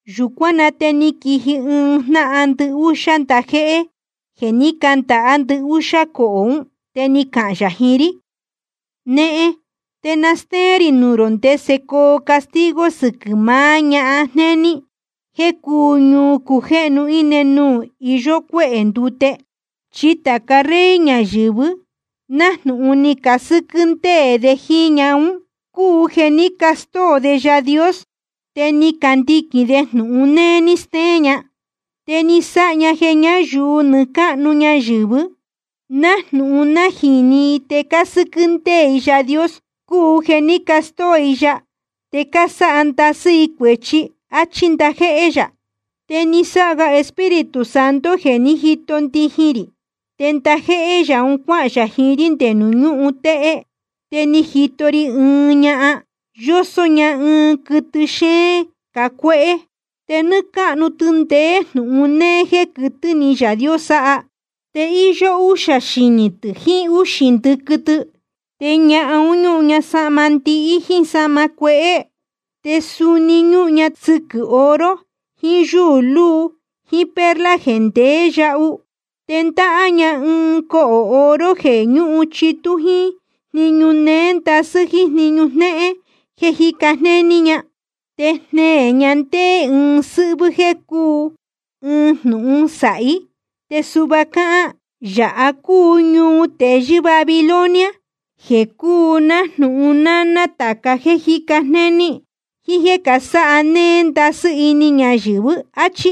Yūcuán na te ni quiji ɨɨn jnáhan ndɨhúxá ndajéhé jeē ní candāhá ndɨhúxá cohō ún, te ni cahān yā jiín rí: Nehen, te na stéén rī nuū rō ndese coo castigo sɨquɨ̄ maá ñahan jnéní jeē cúu ñuu cujéhnu íne nuū iyó cuéhē ndute. Chi tāca rey ñayɨ̄vɨ nájnūhun ni casɨ́quɨ́ ndéē de jíín ñahan ún, cúu jeē ní castóo de Yaā Dios te cándiquīn de jnūhun néé ní steén ña. Te ni sáha ña jeē ñáyuu nɨɨ́ cáhnu ñayɨ̄vɨ, nájnūhun nájīni i te cásɨ́quɨ́ ndéē i Yaā Dios cúu jeē ní castóo i ya te cásáha ndasɨ́ i cuēchi. Achí ndajéhé yā. Te ni sáha ga Espíritu Santo jeē ní jito ndijin rī, te ndajéhé yā un cuáhān yā jiín rí nde nuū ñúhun téhé. Te ni jito ri ɨɨn ñahan, yósó ña ɨɨn quɨtɨ xéén cacuéhé. Te nɨ́ɨ́ cáhnu tɨ ndeé jnūhun néé jéē quɨtɨ́ ni Yaā Dios sáha. Te íyó úxā xinī tɨ̄ jiín úxī ndɨquɨ tɨ. Te ñahan un ñúhun ña sahma ndihí jíín sahma cuehé, te suni ñúhun ña sɨquɨ̄ oro jiín yúū luu jíín perla jeē ndeé yahu. Te ndáhá ña ɨɨn cohō oro jeē ñúhun chitú jíín jniñu néé ndasɨ́ jíín jniñu jnehén jéē jíca jnéní ña. Te jneē ña ndéé ɨɨn sɨ́hvɨ́ jéē cúu ɨɨn jnūhun sāhí, te suhva cáhán: Yāha cúu ñuu teyɨ́ Babilonia, jeē cúu nájnūhun náná tāca jéē cájica jnéní jíín jéē casáha néé ndasɨ́ ini ñayɨ̄vɨ, áchí.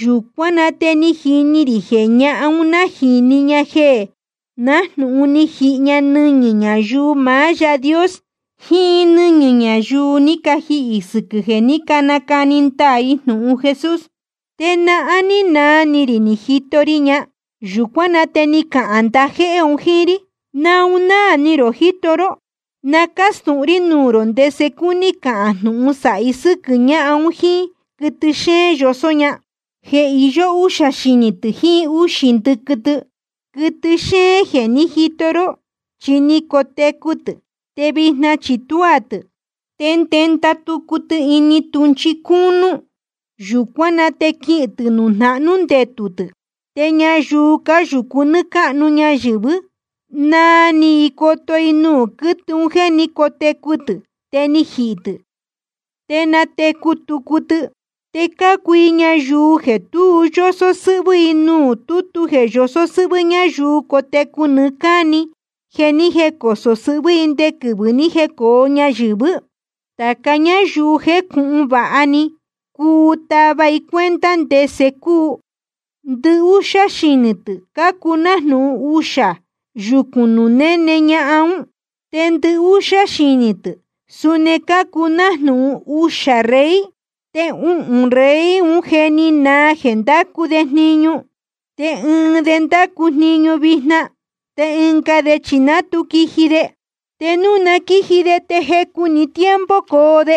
Yūcuán na te ni jini rī jeē ñahan un nájīni ña jeē nájnūhun ni jihi ña nɨñɨ̄ ñayuu maá Yaā Dios jiín nɨ́ñɨ̄ ñayuu ni cajihī sɨquɨ̄ jeē ní canacani ndaā i jnūhun Jesús. Te nahán ní naa ni rī ni jito ri ña. Yūcuán na te ni cahān ndajéhé un jíín rí: ¿Naun náā ni rō jíto ró? Na cástūhun rí nuū rō ndese cúní cahān jnūhun sāhi sɨ́quɨ̄ ñahan un jíín quɨtɨ xéén yosó ña, jeē iyó úxā xinī tɨ̄ jiín úxī ndɨquɨ tɨ. Quɨtɨ xéén jeē ní jito ró, chi ni cotecu tɨ̄, te vijna chi tuá tɨ̄. Te ndenda tucu tɨ ini tūhnchi cúnú, te yūcuán na te quihīn tɨ̄ nuū jnahnú ndetū tɨ̄. Te ñayuu cáyūcu nɨ́ɨ́ cáhnu ñayɨ̄vɨ́, naa ni i coto i nuū quɨ́tɨ un jéē ní cotecu tɨ̄ te ni jihī tɨ̄, te natecu tucu tɨ. Te cácuu i ñayuu jeē tu yósó sɨ́hvɨ́ i nuū tútu jeē yosó sɨ́hvɨ́ ñáyuu cotecu nɨɨ́ cáni jeē ni jécosō sɨhvɨ́ i nde quɨvɨ̄ ni jécōo ñayɨ̄vɨ́. ’Tāca ñáyuu jécūhun vāha ni, cuu tava i cuenta ndese cúu: Ndɨhúxá xinī tɨ̄ cácuu nájnūhun uxā yucu nuū néne ñahan ún. Te ndɨhúxá xinī tɨ̄ suni cácuu nájnūhun uxā rey. Te uhūn rey un je ni naa jeē ndácu de jniñu, te ɨɨn de ndácu jniñu vijna, te ɨnga de chi ná tu quiji de. Te núu na quíji de te jecu‑ni tiempo coo de.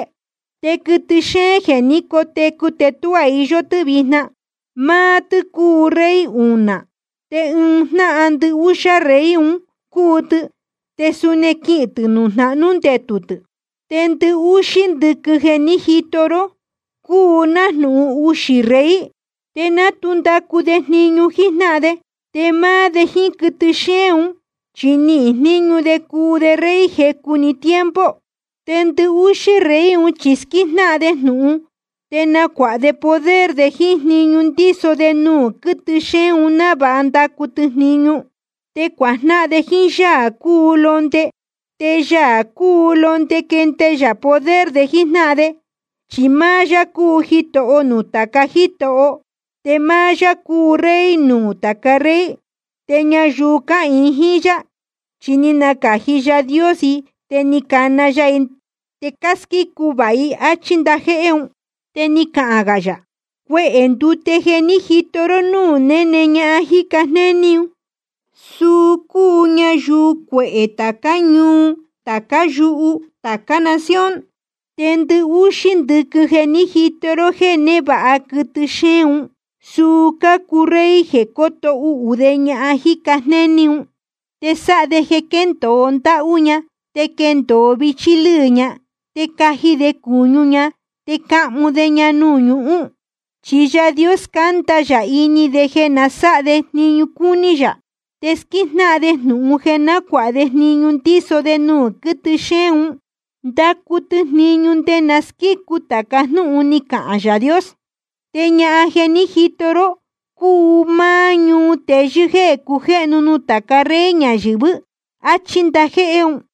Te quɨtɨ xéén jeē ní cotecu te tuá iyó tɨ́ vijna, máá tɨ́ cuu rey unā. Te ɨɨn jnáhan ndɨhúxá rey un cúu tɨ. Te suni quihīn tɨ̄ nuū jnahnú ndetū tɨ̄. ’Te ndɨhúxí ndɨquɨ jeē ní jito ró cúu nájnūhun uxī rey, te ná tu ndacu de jniñu jíjnáhan de. Te máá de jíín quɨtɨ xéén un, chi nihīn jníñu de cuu de rey jecu‑ni tiempo. Te ndɨhúxí rey un chi squíjnáhan de jnūhun, te nacuāha de poder de jíín jniñu ndíso de nuū quɨtɨ xéén un návāha ndacu tɨ jniñu. Te cuajnáhan de jíín Yaā cúu Londe. Te Yaā cúu Londe quende yā poder de jíjnáhan de. Chi máá yá cúu Jitoho nuū tāca jítoho, te máá yá cúu Rey nuū tāca rey. Te ñayuu cáhīin jíín yá, chi ni nacāji Yaā Dios i te ni cana ya i, te cásquícu vāha i. Achí ndajéhé un. Te ni cahān gā yā: Cuehē ndute jeē ní jito ró núū néne ñahan jíca jnéní, suu cúu ñayuu cuehē tācá ñuu, tācá yuhu, tācá nación. Te ndɨhúxí ndɨquɨ jeē ní jito ró jéē névāha quɨtɨ xéén un, suu cácuu rey jeē coto uhū de ñahan jíca jnéní un. Te sáha de jeē quendōo ndáhú ña te quendōo vichí lɨ́ɨ ña. Te caji de cūñu ña te cahmu de ña nuū ñuhún. Chi Yaā Dios scánda ya ini de jeē na sáha de jniñu cúní yā. Te squíjnáhan de jnūhun jeē nacuāha de jniñu ndíso de nuū quɨ́tɨ xéén un, ndacu tɨ jniñu nde na squícu tāca jnúhun ni cahān Yaā Dios. Te ñahan jeē ní jito ró cúu máá ñuu teyɨ́ jéē cujéhnu nuū tāca rey ñayɨ̄vɨ́. Achí ndajéhé un.